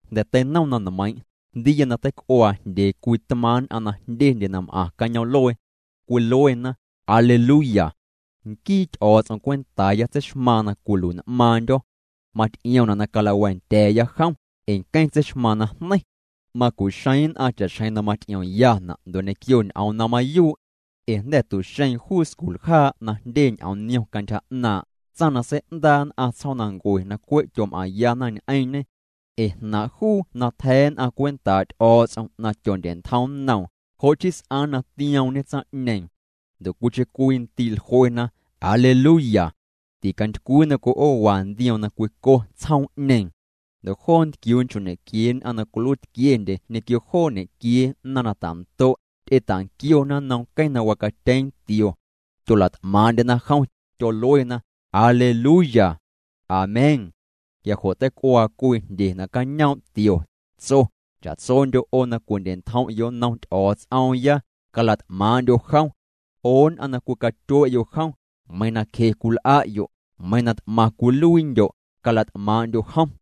Jnda̱ teinom na nmeiiⁿ', jndiiya na teic'uaa jndyee cwii tmaaⁿ' nn'aⁿ na jndyendye na m'aⁿ cañoom'luee. Cwiluena: Aleluya. Nquii Ty'o̱o̱ts'om cwentaaya tseixmaaⁿ na cwilui'n'maaⁿndyo̱. Maty'iomna' na calawa̱a̱ndya̱a̱ya jom, ee nqueⁿ tseixmaaⁿ najneiⁿ. Macu'xeeⁿ nn'aⁿ cha'xjeⁿ na maty'iomyana' ndo' ñequio ñ'oom na mayuu'. Ee jnda̱ tu'xeeⁿ juu sculjaa' na jndye ñ'oom niom cantyja 'naaⁿ', tsaⁿ na sei'ndaa' nn'aⁿ tsjoomnancue na cwe' tyom'aⁿyana ñ'eⁿñe. Ee jnaaⁿ' juu na tja̱ nn'aⁿ cwentaa' Ty'o̱o̱ts'om na tyondye'ntjom nnoom, jo' chii s'aaⁿ na tioomñe tsaⁿ'ñeeⁿ. Ndo' cwiicheⁿ cwii ndii' jluena: —Aleluya. Ticantycwii na cwi'oowa ndioom na cwico tsjoom'ñeeⁿ. Ndo' joo ntquiuu nchoo' ñequiee nn'aⁿ na cwiluiitquiendye ñequio joo ñequiee naⁿ na ta'ndo', ty'eta'nquiona nnom nqueⁿ na wacatyeeⁿ tio. Tyola't'maaⁿ'ndyena jom, tyoluena: —Aleluya. Amén. Quia jo' teic'uaa cwii jndye nacañoom' tio, tso: Cha'tsondyo' 'o na cwindye'ntjom'yo' nnom Ty'o̱o̱ts'oomya, cala't'maaⁿ'ndyo' jom. 'O nn'aⁿ na cwicatyue'yo' jom, meiiⁿ na cje cwil'a'yo', meiiⁿ na t'maⁿ cwiluiindyo', cala't'maaⁿ'ndyo' jom.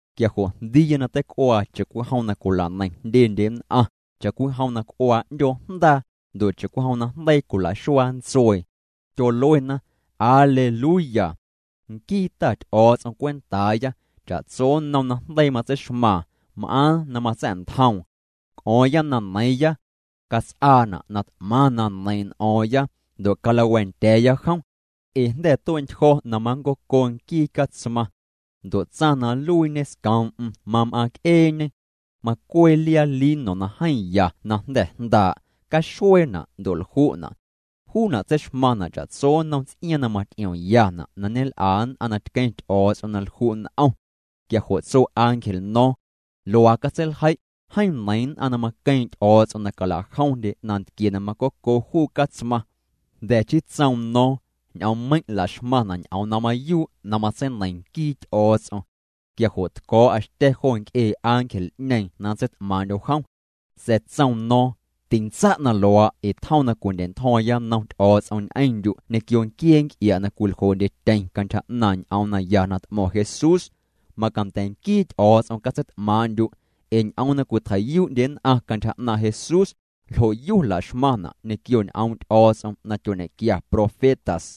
Quia jo' jndiiya na teic'uaa cha'cwijom na cwila'neiⁿ jndyendye nn'aⁿ, cha'cwijom na c'uaa 'ndyoo jndaa, ndo' cha'cwijom na jndeii cwila'xuaa ntsuee. Tyoluena: Aleluya. Nquii Ta Ty'o̱o̱ts'om cwentaaya, cha'tso nnom najndeii matseixmaaⁿ, m'aaⁿ na matsa̱'ntjoom. C'o̱o̱ⁿya na neiiⁿya. Cats'aana' na t'maⁿ na neiiⁿ' n'o̱o̱ⁿya, ndo' calawa̱a̱ndya̱a̱ya jom. Ee jnda̱ tue'ntyjo̱ na manncoco nquii Catsmaⁿ. Ndo' tsaⁿ na nluiiñe scoom'm mam'aaⁿc'eeñe. Macwee liaa lino na jeeⁿ ya na jnda̱ jndaa', caxueena' ndo' lju'na'. Juuna' tseixmaⁿna' cha'tso nnom ts'iaaⁿ na maty'iomyana' na ñel'a nn'aⁿ na tqueⁿ Ty'o̱o̱ts'om na lju' n'om. Quia jo' tso ángel no̱o̱ⁿ: —Luaa catseiljei': “Jeeⁿ neiiⁿ nn'aⁿ na maqueeⁿ' Ty'o̱o̱ts'om na cala'jomndye nantquie na macoco juu Catsmaⁿ.” Jnda̱ chii tsoom no̱o̱ⁿ: —Ñ'oommeiⁿ' la'xmaⁿna' ñ'oom na mayuu' na matseineiⁿ nquii Ty'o̱o̱ts'om. Quia jo' tco̱o̱'a xtya̱ jo nc'ee ángel'ñeeⁿ na nntseit'maaⁿ'ndyo̱ jom. Sa̱a̱ tsoom no̱o̱ⁿ: —Tintsa' na luaa' ee tjom na cwindya̱'ntjo̱o̱ⁿya nnom Ty'o̱o̱ts'om ñ'eⁿndyu' ñequio nquiee nc'ia' na cwiljoo'ndyetyeⁿ cantyja 'naaⁿ' ñ'oom naya na t'mo̱ⁿ Jesús. Macanda̱ nquii Ty'o̱o̱ts'om catseit'maaⁿ'ndyu'. Ee ñ'oom na cwitjei'yuu'ndye nn'aⁿ cantyja 'naaⁿ' Jesús, ljo'yu la'xmaⁿna' ñequio ñ'oom' Ty'o̱o̱ts'om na tyoñequia profetas.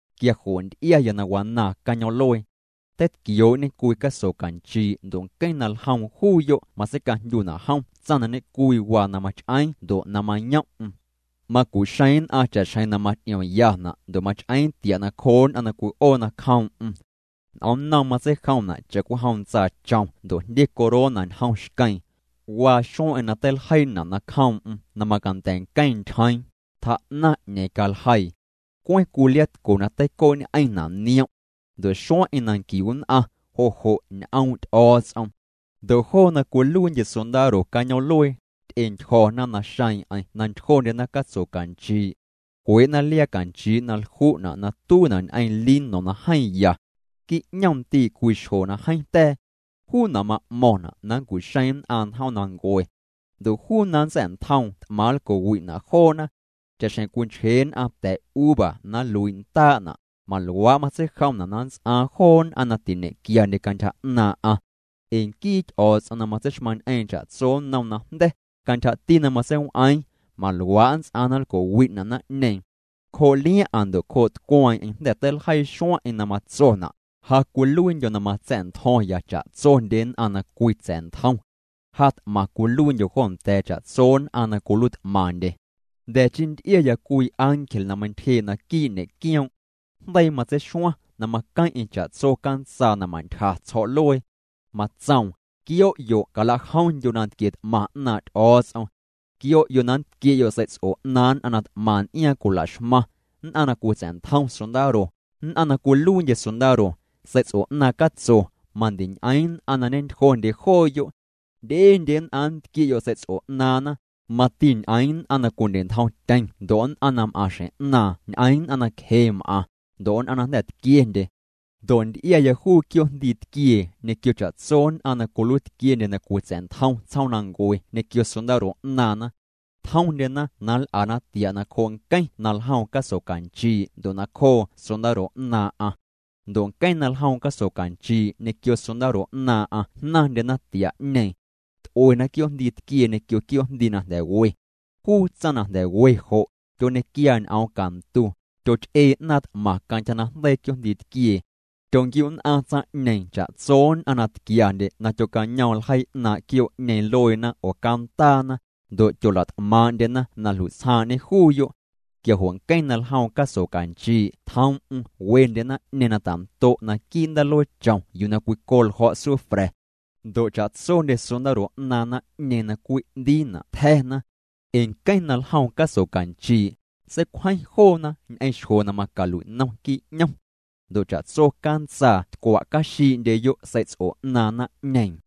Quia jo' nty'iaya na wanaaⁿ cañoom'luee. Teitquioo'ñe cwii caso canchii' ndo' nqueⁿ na ljoom juuyo' matseicajndyuna' jom tsaⁿ na ñe'cwii na mach'eeⁿ ndo' na mayom'm. Macu'xeeⁿ nn'aⁿ cha'xjeⁿ na maty'iomyana' ndo' mach'eeⁿ tia' nacjoo nn'aⁿ na cwi'oo nacjoom'm. N'omnnoom matseijomna' cha'cwijom ntsaachom ndo' jndye corona ñjom xqueeⁿ. Waa xueⁿ'eⁿ na teiljeiina' nacjoom'm na macanda̱ nqueⁿ ntyjeeⁿ, tjaa'naⁿ 'ñeeⁿ caljeii. Cweⁿ cwii liaatco na teicoo'ñ'eⁿna' niom'. Ndo' xueⁿ'eⁿ na nquiu nn'aⁿ, jo' jo' Ñ'oom' Ty'o̱o̱ts'om. Ndo' joo na cwiluiindye sondaro cañoom'luee, ty'entyjo̱na naxeeⁿ'eⁿ na ntyjondyena catso canchii'. Cwee'na liaa canchii' na lju'na' na tuiina' ñ'eⁿ lino na jeeⁿ ya. Quii' 'ñom ndii' cwii xjo na jeeⁿ ta̱a̱. Juuna' ma'mo̱ⁿna' na nncu'xeeⁿ nn'aⁿ njoomnancue. Ndo' juu na nntsa̱'ntjoom t'maⁿ nlco'wi'na' joona. Cha'xjeⁿ cwinchjee nn'aⁿ ta̱uva na nluii' ndaa'na', maluaa' matseijomna' na nnts'aaⁿ joo nn'aⁿ na tiñe'quiandye cantyja 'naaⁿ'aⁿ. Ee nquii Ty'o̱o̱ts'om na matseixmaⁿñ'eeⁿ cha'tso nnom najnda̱, cantyjati na matseiw'eeⁿ, maluaa' nnts'aaⁿ na nlco'wi'na' naⁿ'ñeeⁿ. Cjoo' liaⁿ'aⁿ ndo' cjoo' tcweeⁿ'eⁿ jnda̱ teiljeii xueⁿ'eⁿ na matsona': “Ja cwiluiindyo̱ na matsa̱'ntjo̱ⁿya cha'tsondye nn'aⁿ na cwitsa̱'ntjom. Ja t'maⁿ cwiluiindyo̱ jo nda̱a̱ cha'tso nn'aⁿ na cwiluiit'maⁿndye.” Jnda̱ chii nty'iaya cwii ángel na meintyjee' naquii' ñe'quioom'. Jndeii matseixuaⁿ na maqueⁿ'eⁿ cha'tso cantsaa na ma'ntyja tsjo̱'luee. Matsoom: —Quio'yo' cala'jomndyo' nantquie t'maⁿ 'naaⁿ' Ty'o̱o̱ts'om. Quio'yo' na nntquie'yo' sei'ts'o 'naaⁿ nn'aⁿ na t'maⁿ n'iaaⁿ cwila'xmaⁿ, nn'aⁿ na cwitsa̱'ntjom sondaro, nn'aⁿ na cwiluiindye sondaro, sei'ts'o 'naaⁿ catso, mandiñ'eeⁿ nn'aⁿ na ñentyjondye jooyo'. Jndyendye nn'aⁿ nntquie'yo' sei'ts'o 'naaⁿna, mati ñ'eeⁿ nn'aⁿ na cwindye'ntjomtyeⁿ ndo' nn'aⁿ na m'aaⁿ xjeⁿ 'naaⁿ ñ'eⁿ nn'aⁿ na cje m'aⁿ, ndo' nn'aⁿ na jnda̱ tquiendye. Ndo' nty'iaya juu quioo'jndii tquiee ñequio cha'tso nn'aⁿna cwiluiitquiendye na cwitsa̱'ntjom tsjoomnancue ñequio sondaro 'naaⁿna. Tjomndyena na nl'ana tia' nacjoo' nqueⁿ na ljoom caso canchii' ndo' nacjoo sondaro 'naaⁿ'aⁿ. Ndo' nqueⁿ na ljoom caso canchii' ñequio sondaro 'naaⁿ'aⁿ jnaⁿndyena tia'ñeeⁿ. T'uena quioo'jndii tquiee ñequio quioo'jndii na jnda̱ we. Juu tsaⁿ na jnda̱ we jo', tyoñequiaa ñ'oom cantu, tyoch'ee 'naaⁿ t'maⁿ cantyja najndeii quioo'jndii tquiee. Tyonquiu'nn'aⁿ tsaⁿ'ñeeⁿ cha'tso nn'aⁿ na tquiandye na tyocañoom ljeii 'naaⁿ' quioo'ñeeⁿ lueena oo cantaana, ndo' tyola't'maaⁿ'ndyena na jlui'tsjaaⁿ'ñe juuyo'. Quia jo' nqueⁿ na ljoom caso canchii' tjoom'm wendye naⁿ'ñeeⁿ na tando' naquii' ndaaluee chom yuu na cwico ljo̱' sufra̱. Ndo' cha'tsondye sondaro 'naaⁿ naⁿ'ñeeⁿ na cwi'ndiina' tja̱na. Ee nqueⁿ na ljoom caso canchii', seicwjeⁿ joona ñ'eⁿ xjo na macalui'nom quii' 'ñom. Ndo' cha'tso cantsaa tcwa'caxii'ndyeyo' sei'ts'o 'naaⁿ naⁿ'ñeeⁿ.